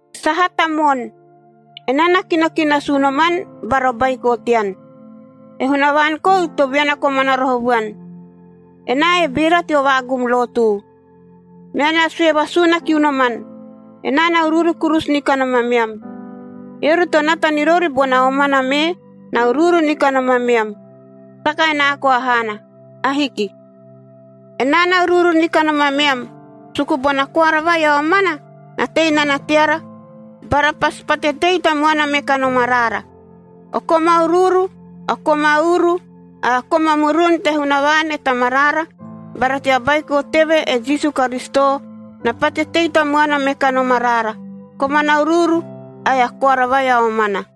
Sahata moon! Enaa na kino ki nasu unoman bara o baiko tean.a E Hunavaan kou to viana komana roho vuan. Enaa e beera teo vaagum lotu. Menaa na sue vasuuna kiu noman, enaa na uruuru kurusu ni kanom ameam. Eori to nata ni rori bona omana mee, na uruuru ni kanom ameam. Saka enaa koa haana. Ahiki. Enam na uruuru ni kanom ameam suku bona koara vai a omana na tei nana teara bara pasi pate tei tamuana me kanom araara. O koma uruuru, koma uru ae koma murun te Hunavaan e Tamaraara bara tea Baiko teve, e Jisu Karisito, na pate tei tamuana me kanom araara komana uruuru ae a koara vai a omana.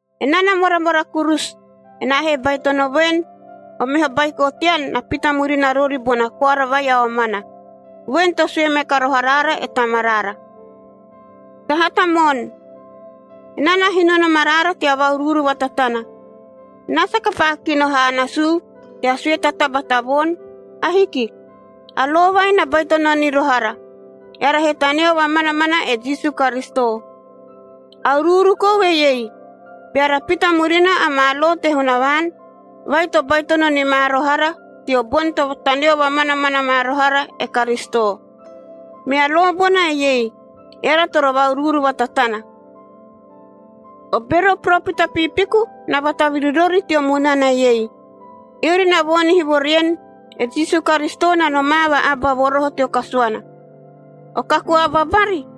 Enaa na moramora kurusu, enaa he baitono voen, o meho baiko tean na pita murina rori bona koara vai a omana, voen to sue me ka roho araara e Tamaraara. Sahata moon! Enaa na hino nom araara tea va-uruuru vatatana. Enaa saka paa kino haa nasuu tea sue ta taba ta voon. Ahiki. A lo vai na baitono ni roho ara, eara he taneo vamanamana e Jisu Karisito. A uruuru kou eiei: Beara pita murina amaa lo te Hunavaan vai to baitono ni ma roho ara teo boni to taneo vamanamana ma roho ara e Karisito. Mea lo bona eiei: Eara toro va-uruuru vatatana. O bero o poropita piipiku na vataviri rori teo munana ei. Eori na voonihi vo rien, e Jisu Karisito na nomaa va aba vo roho teo kasuana. O kaku aba bari,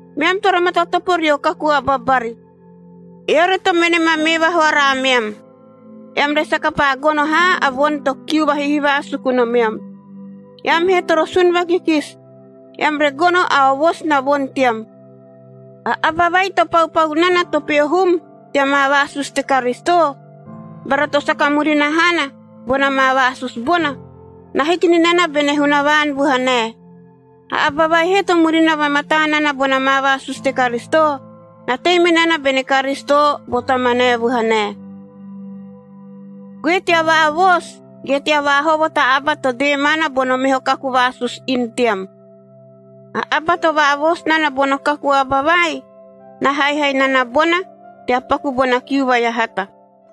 Meam toro matatopo rio kaku aba bari. Eori to mene ma mee vahoara ameam, eam re saka paa gono haa a voni to kiu vahihivaa suku nomeam. Eam he toro sun vakikisi, eam re gono a ovosi na voni team. A aba vai to paupau nana to peho hum tea maa vaasusu te Karisito bara to saka murina haana bona maa vaasusu bona, na hiki ni nana bene Hunavaan vuhanae. A aba vai he to murina vamataa nana bona maa vaasusu te Karisito, na tei me nana bene Karisito bo Tamanae vuhanae. Goe tea vaavoosu ge tea vaahovo ta aba to dee maana bono meho kaku vaasusu, inu team. A aba to vaavoosu nana bono kaku aba vai, na haihai nana bona tea paku bona kiu vai a hata.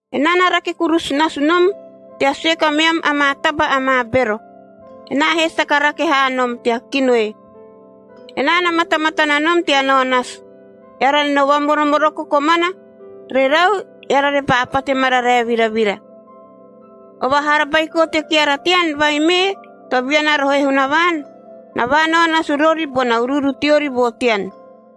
Enaa na rake kurusu nasu nom tea sue kameam amaa taba amaa bero. Enaa he saka rake haa nom tea kino e. Enaa na matamatana nom tea nao nasu, eara re no vamoromoroko komana. Rerau, eara repaa pate mararae viravira. O vahara baiko te keara teanc vai mee to viana roho e Hunavaan, na vaanao nasu rori bona uruuru teori vo tean.